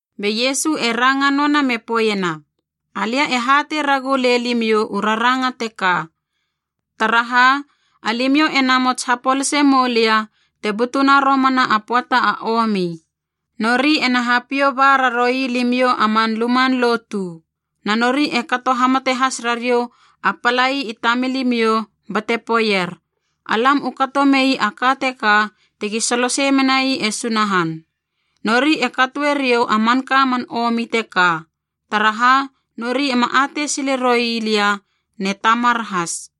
Be Iesu e ranga noana me poeiena, “Alia e hatei ragu lei limiou u raranga teka, taraha alimiou e namots hapolase moulia te butuna romana a pöata a omi. Nori ena hapiou ba raroui limiou a man luman lotu, na nori e kato hamate has rariou a palai i tamilimiou bate poeier, ‘Alam u kato mei a ka teka tegi solosei menai e Sunahan.’ Nori e katoe riou a manka man omi teka, taraha nori ema atei sile roi lia ne Tamar has.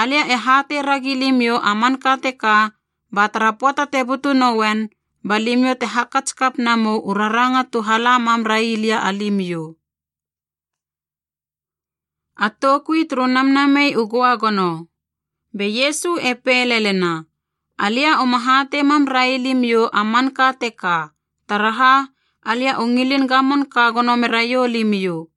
Alia e hatei ragi limiou a manka teka ba tara pöata te butu nouen, ba limiou te hakats kap namou u raranga tu hala mam ra ii lia alimiou.” A toukui turu Namnamei u Göagono Be Iesu e pei lelena, “Alia uma hatei mam railimiou a manka teka, taraha alia u ngilin gamon ka gono meraiou limiou.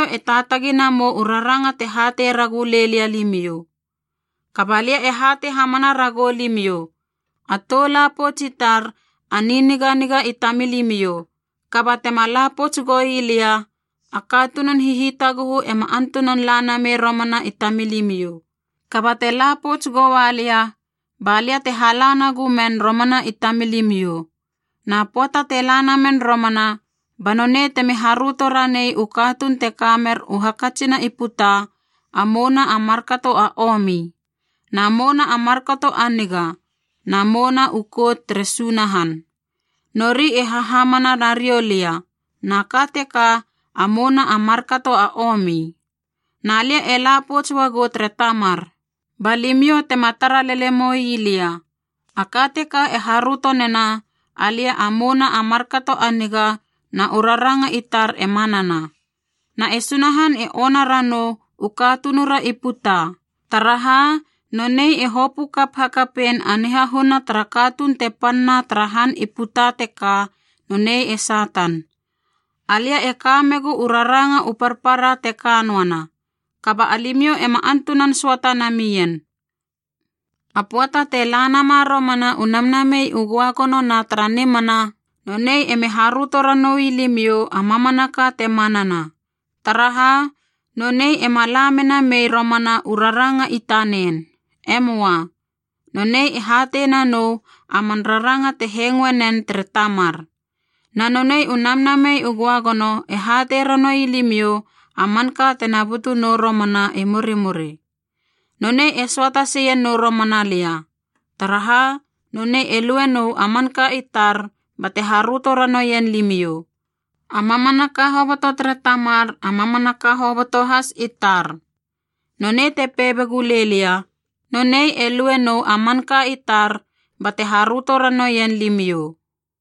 Kaba limiou e taatagi namou u raranga te hatei ragu lei lia limiou. Kaba lia e hatei hamana ragou limiou, a tou la pouts i tar, a niniganiga i tamilimiou. Kaba tema la pouts goi lia, a katunun hihitaguhu ema antunan la namei romana i tamilimiou. Kaba te la pouts goua lia, ba lia te hala nagu men romana i tamilimiou. Na pöata te la namen romana, ba nonei temi haröto ranei u katuun te ka mer u hakatsina i puta a mouna a markato a omi, na mouna a markato a niga, na mouna u kout tere Sunahan. Nori e hahamana nariou lia, na ka teka a mouna a markato a omi. Na lia e la pouts uagou tere Tamar, ba limiou tema tara lele moi lia. A ka teka e haröto nena alia a mouna a markato a niga na u raranga i tar e manana. Na e Sunahan e ona ranou u katunura i puta, taraha nonei e hopö kap hakapein a nihahuna tara katuun te panna tara han i puta teka, nonei e Satan. “Alia e ka megu u raranga u parpara te ka noana, kaba alimiou ema antunan söata namien. A pöata te la nama romana u Namnamei u Göagono na tara nimana, nonei emi haröto ranoui limiou a mamanaka te manana. Taraha, nonei ema la mena mei romana u raranga i tanen. E möa. Nonei e hatei nanou a man raranga te hengoe nen tere Tamar. Na nonei u Namnamei u Göagono e hatei ranoui limiou a manka tena butu nou romana i murimuri. Nonei e söata seie nou romana lia, taraha nonei e luenou a manka i tar bate haröto ranoien limiou. A mamanaka hoboto tere Tamar, a mamanaka hoboto has i tar. Nonei te pei begu lei lia, ‘Nonei e lue nou a manka i tar bate haröto ranoien limiou.’”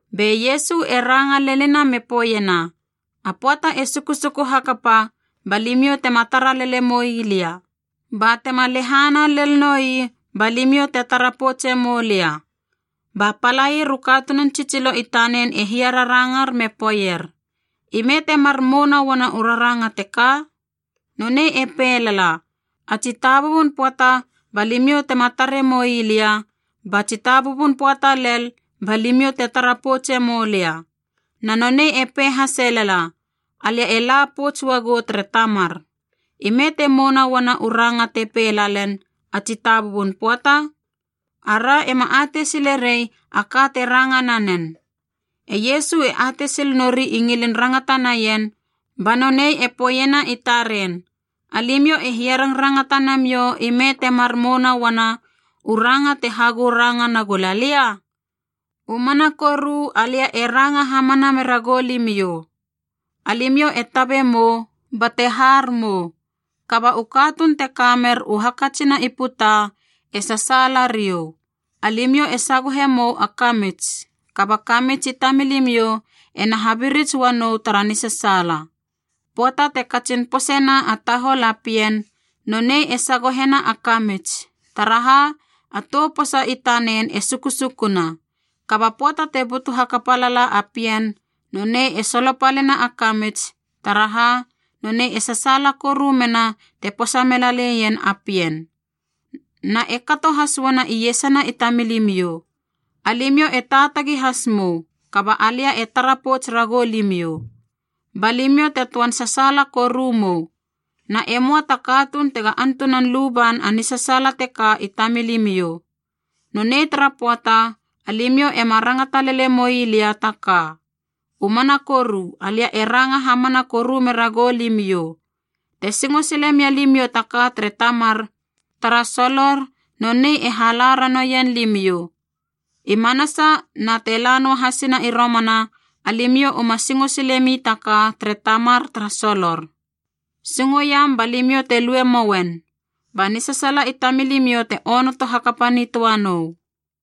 Be Iesu e ranga lenina me poeiena, “A pöata e sukusuku hakapa ba limiou tema tara lele moi lia. Ba tema lehana lel noi ba limiou te tara poutse moua lia.” Ba palair u katunun tsitsilo i tanen e hiararangar me poeier, “Ime temar mouna uana u raranga teka? Nonei e pei lala, ‘A tsitabubun pöata ba limiou tema tare moi lia, ba tsitabubun pöata lel ba limiou te tara poutse moulia.’ Na nonei e pei hase lala, ‘Alia e la pouts uagou tere Tamar.’ Ime te mouna uana u ranga te pei lalen, ‘A tsitabubun pöata’? Ara ema atei sile rei a ka te ranga nanen.” E Iesu e atei sil nori i ngilin rangata naien, ba nonei e poeiena i taren, “Alimiou e hiarangrangata namiou ime temar mouna uana u ranga te hagou ranga nagula lia? U mana koru alia e ranga hamana mera goulimiou, alimiou e tabe mou bate har mou, kaba u katuun te ka mer u hakatsina i puta e sasaala riou. Alimiou e sagohe mou a kamits, kaba kamits i tamilimiou ena habirits ua nou tara nisasaala. Pöata te katsin poseiena a tahol a pien, nonei e sagohena a kamits, taraha a tou posa i tanen e sukusukuna. Kaba pöata te butu hakapa lala a pien, nonei e solopalena a kamits, taraha nonei e sasaala koru mena te posa mela leien a pien. Na e kato has uana iesana i tamilimiou. Alimiou e taatagi has mou, kaba alia e tara pouts ragou limiou. Ba limiou te töan sasaala koru mou, na e möa ta katuun tega antunan luban a nisasaala teka i tamilimiou. Nonei tara pöata, alimiou ema rangata lele moi lia ta ka. U mana koru alia e ranga hamana koru mera goulimiou, te singo sile mia limiou ta ka tere Tamar tara solor nonei e hala ranoien limiou. I manasa na te la noa hasina i romana alimiou uma singo silemi ta ka tere Tamar tara solor. Singoiam ba limiou te lue mouen, ba nisasaala i tamilimiou te onoto hakapa nitöa nou.”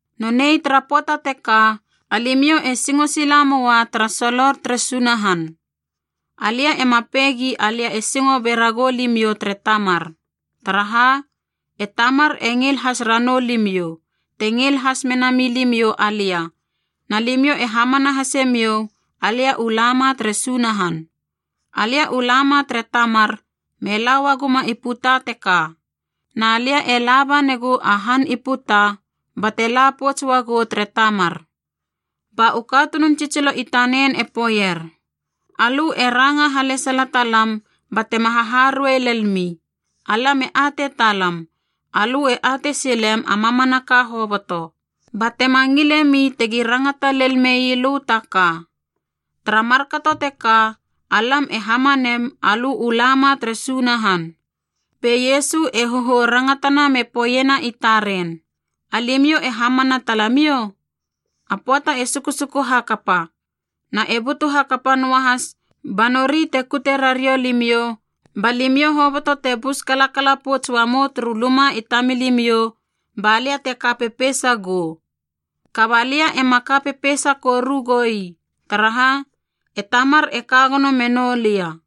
Nonei tara pöata teka, alimiou e singo sila moa tara solor tere Sunahan. Alia ema pei gi alia e singo be ragou limiou tere Tamar. Taraha, e Tamar e ngil has ranou limiou, te ngil has menami limiou alia na limiou e hamana hase miou alia u lama tere Sunahan. Alia u la ma tere Tamar me la uaguma i puta teka. Na lia e laba negu a han i puta bate la pouts uagou tere Tamar.” Ba u katunun tsitsilo i tanen e poeier, “Alö e ranga halesala talam batema haharuei lelmi. Alam e atei talam alö e atei silem a mamanaka hoboto, ba tema ngile mi tegi rangata lel mei lö ta ka. Tara markato teka alam e hamanem alö u lama tere Sunahan.” Be Iesu e hohou rangatana me poeiena i taren, “Alimiou e hamana talamiou? A pöata e sukusuku hakapa, na e butu hakapa noahas ba nori te kute rariou limiou ba limiou hoboto te bus kalakala pouts uamou turu luma i tamilimiou ba lia te ka pepeisa gou. Kaba lia ema ka pepeisa koru goi, taraha e Tamar e ka gono menou lia.